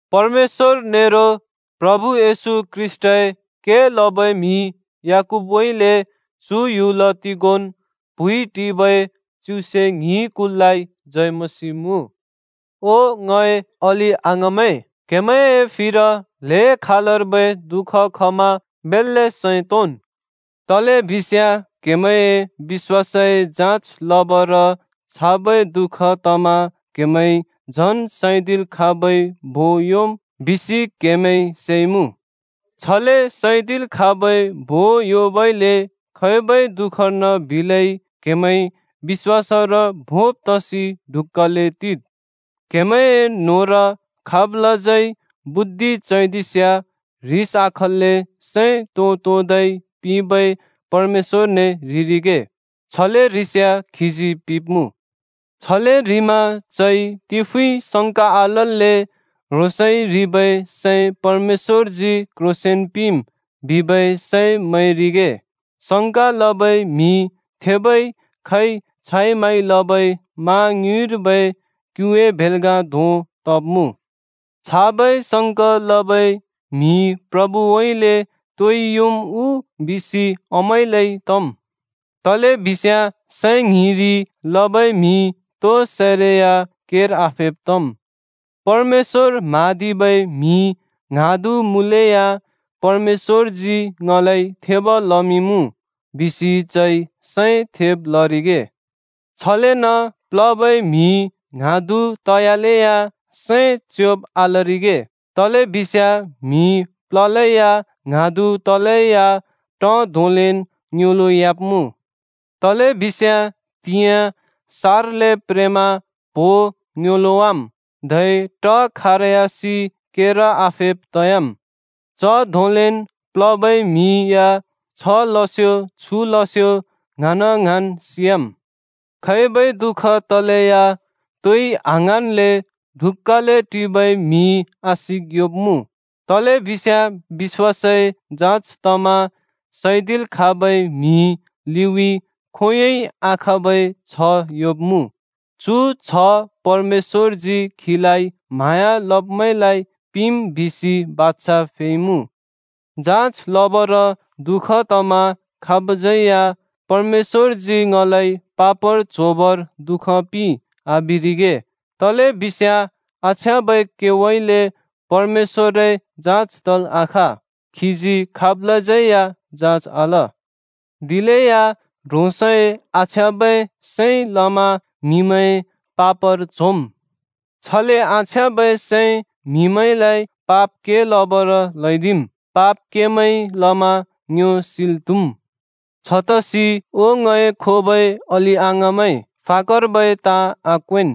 परमेश्‍वर नेरो प्रभु येशू ख्रीष्‍टए के लबै म्‍हि याकूबउँइँले चु ह्‍युल तिगोंन् प्हुँइ टिबै च्युसे ङ्हिं कुललाइ जय मसीह मुँ। ओ ङए अलि-अङाँमैं, क्‍हेमैंए फिर ल्हें खालर्बै दुःख खमा बेल्‍ले सैं तोंन्। तलेबिस्याँ क्हेमैंए बिश्‍वासए जाँच लबर छाबै दु:ख तमा क्हेमैंइ झन् सैदिल् खाँबै भों योंम् बिसि क्हेमैंइ सेइमुँ। छले सैदिल् खाँबै भों योंबइले खैबै दु:खर्न बिलै क्हेमैं बिश्‍वासर भोंब तसि ढुक्‍काले टिद्। क्‍हेमैंए न्‍होंर खाबलाज्यै बुद्धि चैदिस्याँ ह्रिस आखल्‍ले सैं तों-तोंदै पिंबै परमेश्‍वरने ह्रिरिगे। छले ह्रिस्याँ खीजी पिंब्‍मुँ। छले ह्रिमा चइ तिफुँइ संका आलल्‍ले “ह्रोंसइ ह्रिबै सै परमेश्‍वरजी क्ह्रोंसेंन पिंम्” बिबै सैं मैंरिगे। संका लबै म्हि थेबै खैंइ छाइ-माइ लबै मा ङ्युँइर्बै क्‍युए भेल्‍गा धों तब्मुँ। छाबै संक लबै म्हिइ प्रभुउँइँले तोइ योंम् उ बिसि आमैंलै तम्। तलेबिस्याँ सैं ङ्हिंरि लबै म्हि तो सैरै या केर आफेब् तम्। परमेश्‍वर म्हाँदिबै म्‍हि ङ्हाँदु मुँलेया “परमेश्‍वरजी ङलाइ थेब लमिंइमुँ!” बिसि चइ सैं थेब लरिगे। छलेन प्लबै म्‍हि ङ्हाँदु तयालेया सैं च्योंब् आलरिगे, तलेबिस्याँ म्हि प्ललैया ङ्हाँदु तलैया ट धोंलेन् ङ्योंलोंयाब्मुँ। तलेबिस्याँ त्‍हिंयाँ सार्ले प्रेमा प्हो ङ्योंलोंवाम्, धै ट खारयासि केर आफेब् तयाम्। च धोंलेन् प्लबै म्‍हि या छ लस्यो छु लस्यो ङ्हाँन-ङ्हाँन् सियाम्। खैबै दुःख तलेया तोइ आङ्हाँन्ले ढुक्‍काले टिबै म्हिइ आशिक योंब्मुँ, तलेबिस्याँ बिश्‍वासए जाँच तमा सैदिल् खाँबै म्हिइ लिउँइँ खोंयोंइ आखाँबै छ्ह योंब्मुँ। चु छ्ह परमेश्‍वरजी खीलाइ म्हाँया लब्मैंलाइ पिंम् बिसि बाछा फैइमुँ। जाँच लबर दुःख तमा खाबज्यै या “परमेश्‍वरजी ङलाइ पापर च्होबर दु:ख पिंइ” आबिरिगे, तलेबिस्याँ आछ्याँबै केउँइँले परमेश्‍वरए जाँज तल् आखाँ, खीजी खाबलाज्यै या जाँच आल। दिलेया ह्रोंसए आछ्याँबै सैंइ लमा म्हिमैं पापर च्होम्। छले आछ्याँबै सैंइ म्हिमैंलाइ पाप के लबर ल्हैदिम्। पाप केमैंइ लमा ङ्यो सिल् त्हुम्। छतसि ओ ङए खोबै अलि-अङाँमैं, फाकर्बै ताँ आक्वेंन्: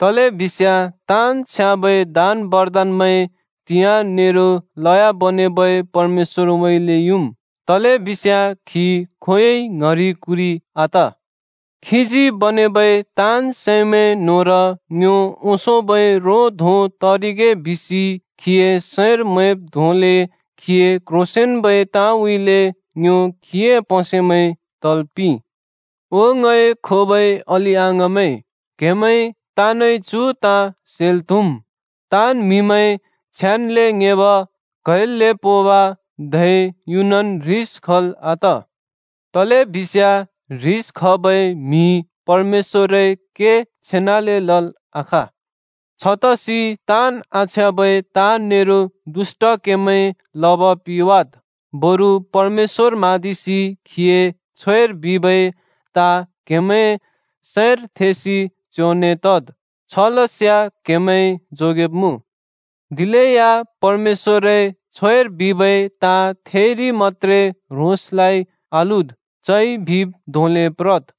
तलेबिस्याँ ताँन् छ्याँबै दान बरदानमैं त्हिंयाँ नेरो लयाँ बनेबै परमेश्‍वरउँइँले युम्। तलेबिस्याँ खी खोंयोंइ ङ्हरि कुरि आत। खीजी बनेबै ताँन् सैमैं न्‍होंर ङ्यो ओंसोंबै रो धों तरिगे बिसि खीए सैंर मैंब् धोंले खीए क्‍ह्रोंसेंन्‍बै ताँउँइँले ङ्यो खीए प्‍हसेमैं तल् पिंइ। ओ ङए खोबै अलि-अङाँमैं, क्हेमैं ताँनइ चु ताँ सेल् त्हुम्, ताँन् म्हिमैं छिट्ले ङेंब, क्हैल्‍ले पोंल् त्हुम्, धै युनन् ह्रिस खल् आत। तलेबिस्याँ ह्रिस खबै म्हिइ परमेश्‍वरए के छेनाले लल् आखाँ। छतसि ताँन् आछ्याँबै ताँ नेरो दुष्‍ट केमैं लब पिवाद्, बरु परमेश्‍वर म्हाँदिसि खीए छ्वेर बिबै ताँ क्हेमैंए सैंर थेंसि च्योंने तद्। छलस्याँ क्‍हेमैं जोगेब्मुँ। दिलेया परमेश्‍वरए छ्वेर बिबै ताँ थेइरि मत्‍त्रे ह्रोंसलाइ आलुद्, चइ बिब् धोंले प्रद्।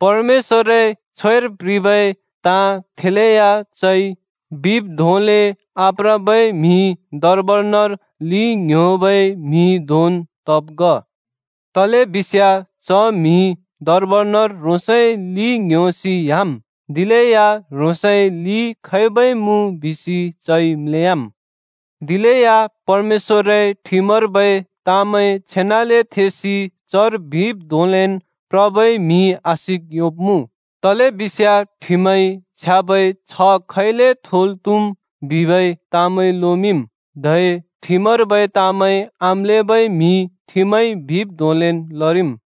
परमेश्‍वरए छ्वेर प्ह्रिबै ताँ थेलेया चइ बिब् धोंले आप्रबै म्‍हि दर्बनर लि ङ्ह्‍योबै म्‍हि धोंन् तब् ग। तलेबिस्याँ च म्‍हिइ दर्बनर ह्रोंसए लि ङ्ह्‍योसि ह्‍याम्, दिलेया ह्रोंसए लि खैबै मुँ बिसि चइ म्‍लेयाम्। दिलेया परमेश्‍वरए ठिमर्बै ताँमैं छेनाले थेसि चर बिब् धोंलेन् प्रबै म्‍हिइ आशिक योंब्मुँ। तलेबिस्याँ ठिमइ छ्याँबै छ्ह खैले थोल् त्हुम् बिबै ताँमैं लोमिंम्, धै ठिमर्बै ताँमैं आम्‍लेबै म्हि ठिमइ बिब् धोंलेन् लरिम्।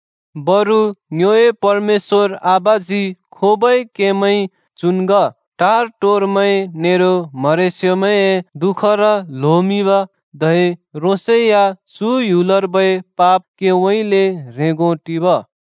बरु ङ्योए परमेश्‍वर आबाजी खोबै केमैं चुन् ग: टार-टोरमैं नेरो म्हरेस्योमैंए दुःखर ल्होमिंब, धै ह्रोंसै या चु ह्‍युलर्बै पाप केउँइँले ह्रेंगो टिब।